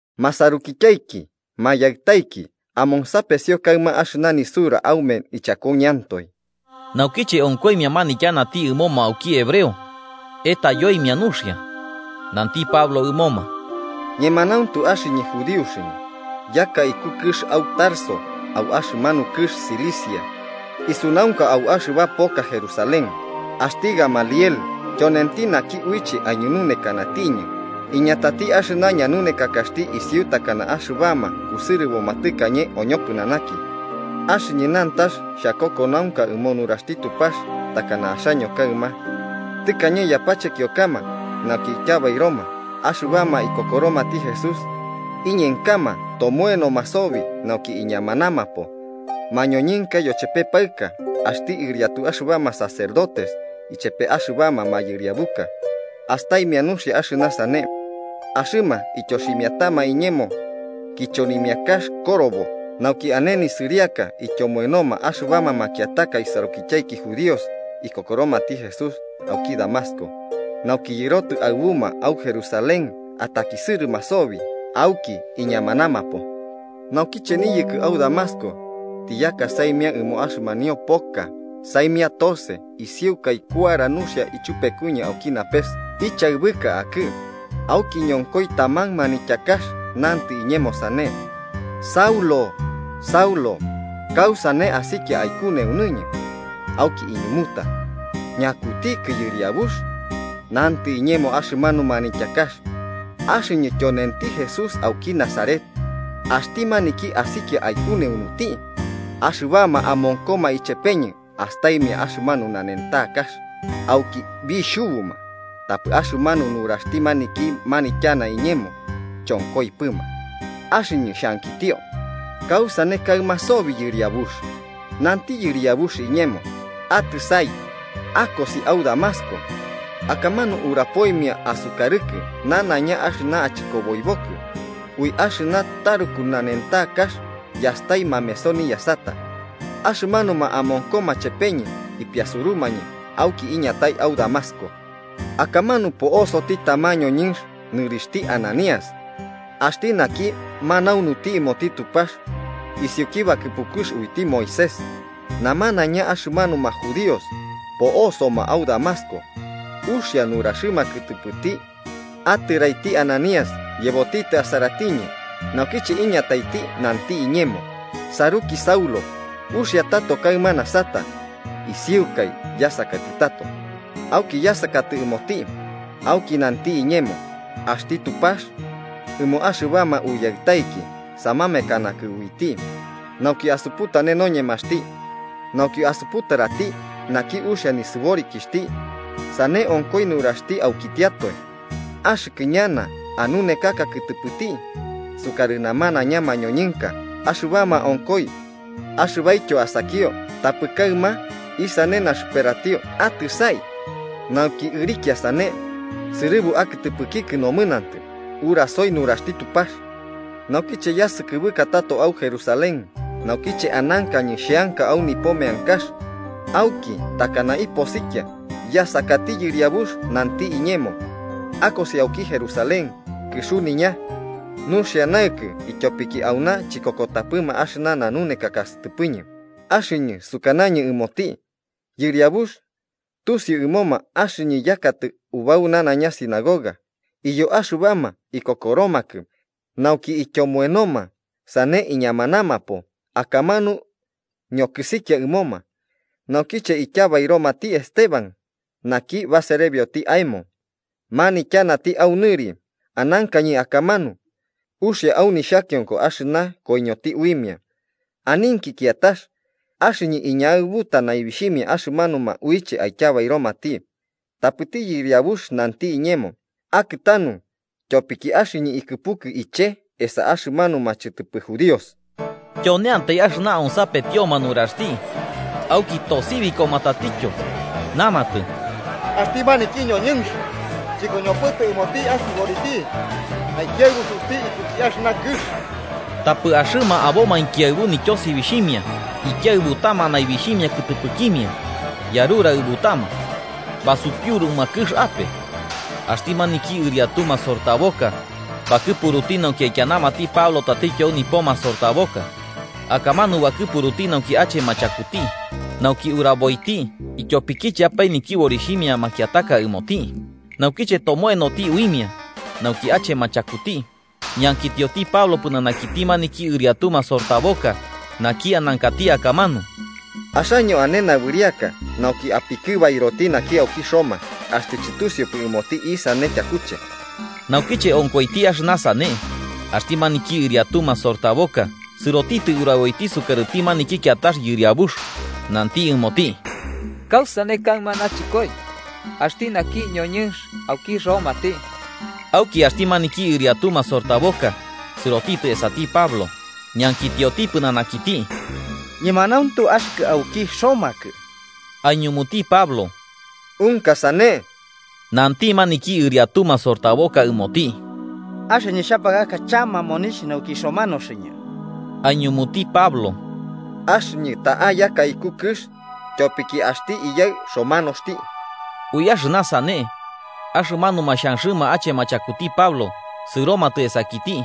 “Masarukityaiki mayaɨtaiki, amonsapesio kaɨma axɨna nisura aume ichakuñɨantoe.” Naukiche onkoimia manityanati ɨmoma auki hebreo, etaiyoimia nuxia, nanti Pablo ɨmoma: 3–Ñemanauntu axɨñɨ judíoxɨñɨ, yaka iku kɨx au Tarso au axɨmanu kɨx Cilicia, isunaunka au axɨba poka Jerusalén, axti Gamaliel tyonenti naki uiche aiñununekanatiñɨ, iñatati axɨna ñanunekakaxti isiu takana axɨbama kusɨrɨboma tɨkañe oñopɨnanaki. Axɨñɨ nantax xhakokonaunka ɨmo nuraxti Tupax takana axaño kaɨma. Tɨkañe yapachekiokama nauki ityabairoma axɨbama ikokoromati Jesús, iñenkama tomoenoma sobi nauki iñamanamapo, mañoñɨnka yochepe paɨka. Axti ɨriatu axɨbama sacerdotes ichepe axɨbama mayɨriabuka, astaimia nuxia axɨna sane. Axɨma ityoximiatama iñemo kichonimiakax korobo nauki ane nisɨriaka ityomoenoma axɨbama makiataka isarukityaiki judíos ikokoromati Jesús auki Damasco, nauki yɨrotɨ aɨbuma au Jerusalén atakisɨrɨma sobi auki iñamanamapo. “Naukiche niyɨkɨ au Damasco, tiyaka saimia ɨmo axɨmanio poka, saimia tose, isiukai kuara nuxia ichupekuñɨ auki napes, ichaɨbɨka akɨ. Auki ñonkoi taman manityakax, nantɨ iñemo sane: ‘Saulo, Saulo, ¿kausane asikia aikuneunuñɨ?’ Auki iñumuta: ‘¿Ñakutikɨ, Yɨriabux?’ Nantɨ iñemo axɨmanu manityakax: ‘Axɨñɨ tyonenti Jesús auki Nazaret, axti maniki asikia aikuneunuti.’ Axɨbama amonkoma ichepeñɨ astaimia axɨmanu nanentakax, auki bixhubuma, tapɨ axɨmanu nuraxti maniki manityanati iñemo, chonkoipɨma. Axɨñɨ xhankitio: ‘¿Kausane kaɨma sobi, Yɨriabux?’ Nanti Yɨriabux iñemo: ‘Atɨsai, akosi au Damasco. Akamanu urapoimia asukarɨkɨ nanaiña axɨna achɨkoboibokɨ.’ Ui axɨmanu taruku nanentakax yastai mameso niyasata, axɨmanuma amonkoma chepeñɨ ipiasurumañɨ auki iñatai au Damasco. “Akamanu po'osoti tamanti ñoñɨnx, nɨrixhti Ananías, axti naki manaunuti ɨmoti Tupax, isiuki bakɨpukux uiti Moisés, namanaiña axɨmanuma judíos po'osoma au Damasco uxia nuraxɨma kɨtɨpɨti. Atɨraiti Ananías yebotitɨ asaratiñɨ, naukiche iñataiti nanti iñemo: ‘Saruki Saulo, uxia tato kaɨma nasata.’ Isiukai yasakatɨ tato, auki yasakatɨ ɨmoti. Auki nanti iñemo: ‘Axti Tupax ɨmo axɨbama uyaɨtaiki samamekanakɨ uiti nauki asuputane noñemaxti, nauki asuputarati naki uxia nisɨborikixhti, sane onkoi nuraxti aikitiatoe. Axɨkɨ ñana anunekaka kɨtɨpɨti sukarɨ namanaiña mañoñɨnka, axɨba onkoi axɨbaityo asakio. Tapɨ kaɨma, isane naxɨperatio. Atɨsai, nauki ɨrikia sane sɨrɨbu akɨtɨpɨkikɨ nomɨnantɨ, urasoi nuraxti Tupax.’ “Naukiche yasɨkɨbɨka tato au Jerusalén, naukiche anankañɨ xheanka au nipo meankax, auki takana iposikia. Yasakati Yɨriabux, nanti iñemo: ‘Akosi auki Jerusalén kɨxuniña nuxia naɨkɨ, ityopiki auna chikokotapɨma axɨna nanunekaka sɨtɨpɨñɨ.’ Axɨñɨ sukanañɨ ɨmoti: ‘Yɨriabux, tusiu ɨmoma axɨñɨ yakatɨ ubau nanaiña sinagoga iyo axɨbama ikokoromakɨ nauki ityomoenoma sane iñamanamapo akamanu ñokɨsikia ɨmoma, naukiche ityabairomati Esteban, naki baserebioti aemo manityanati au nɨri, anankañɨ akamanu, uxia au nixhakionko axɨna koiñoti uimia, aninki kiatax, axɨñɨ iñaɨbuta naibixhimia axɨmanuma uiche aityabairomati.’ Tapɨti Yɨriabux nanti iñemo: ‘Akɨtanu, tyopiki axɨñɨ ikɨpukɨ iche esa axɨmanuma chɨtɨpɨ judíos.’” Tyoneantai axɨna onsapetioma nuraxti. Auki tosibikoma tatityo, namatɨ: “¡Axti maniki ñoñɨnx chɨkoñopɨtɨ ɨmoti asɨboriti! ¡Aikiaɨbusuti ikuki axɨna kɨx!” Tapɨ axɨma abomainki aɨbu nityosibixhimia ikiaɨbutama naibixhimia kɨtɨpɨkimia yarutaɨbutama basupiuruma kɨx ape, axti maniki ɨriatu masortaboka bakɨpuruti nauki aikianamati Pablo tatityo au nipo masortaboka, akamanu bakɨpuruti nauki achema chakuti, nauki uraboiti ityopikicheapae nityɨborixhimia makiataka ɨmoti. Naukiche tomoenoti uimia nauki achema chakuti, ñankitioti Pablo pɨnanakiti maniki ɨriatu masortaboka naki anankati akamanu: –¿Axaño ane nabɨriaka nauki apikɨbairoti naki auki Roma, axtɨ chɨtusiupɨ ɨmoti isane tyakuche? Naukiche onkoiti axɨna sane, axti maniki ɨriatu masortaboka sɨrotitɨ uraboiti sukarɨti maniki kiatax yɨriabux, nanti ɨmoti: –¿Kausane kaɨma nachɨkoi? Axti naki ñoñɨnx auki romati. Auki axti maniki ɨriatu masortaboka sɨrotitɨ esati Pablo, ñankitioti pɨnanakiti: –¿Ñemanauntu axɨkɨ auki romakɨ? Aiñumuti Pablo: –Unka sane. Nanti maniki ɨriatu masortaboka ɨmoti: –Axɨñɨ xhapakaka chama monixh nauki romanoñɨ. Aiñumuti Pablo: –Axɨñɨ ta'a yaka iku kɨx, ityopiki axti iyaɨ romanoxti. Ui axɨna sane, axɨmanuma xhanxɨma achema chakuti Pablo sɨromatɨ esakiti.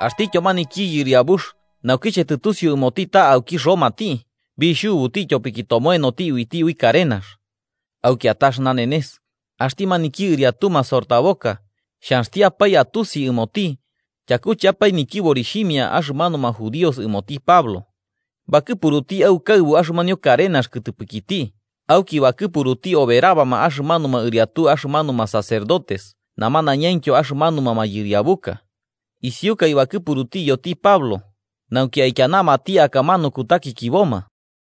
Axtityo maniki yɨriabux naukiche tɨtusiu ɨmoti ta auki romati, bixhubuti tyopiki tomoenoti uiti ui karenax. Au kiatax nanenes, axti maniki ɨriatu masortaboka, xhanxtiapae atusi ɨmoti tyakucheapae nityɨborixhimia axɨmanuma judíos ɨmoti Pablo, bakɨpuruti aukaɨbu axɨmanio karenax kɨtɨpɨkiti auki bakɨpuruti oberabama axɨmanuma ɨriatu axɨmanuma sacerdotes namanañaintyo axɨmanuma mayɨriabuka. Isiukai bakɨpuruti iyoti Pablo nauki aikianamati akamanu kutakikiboma.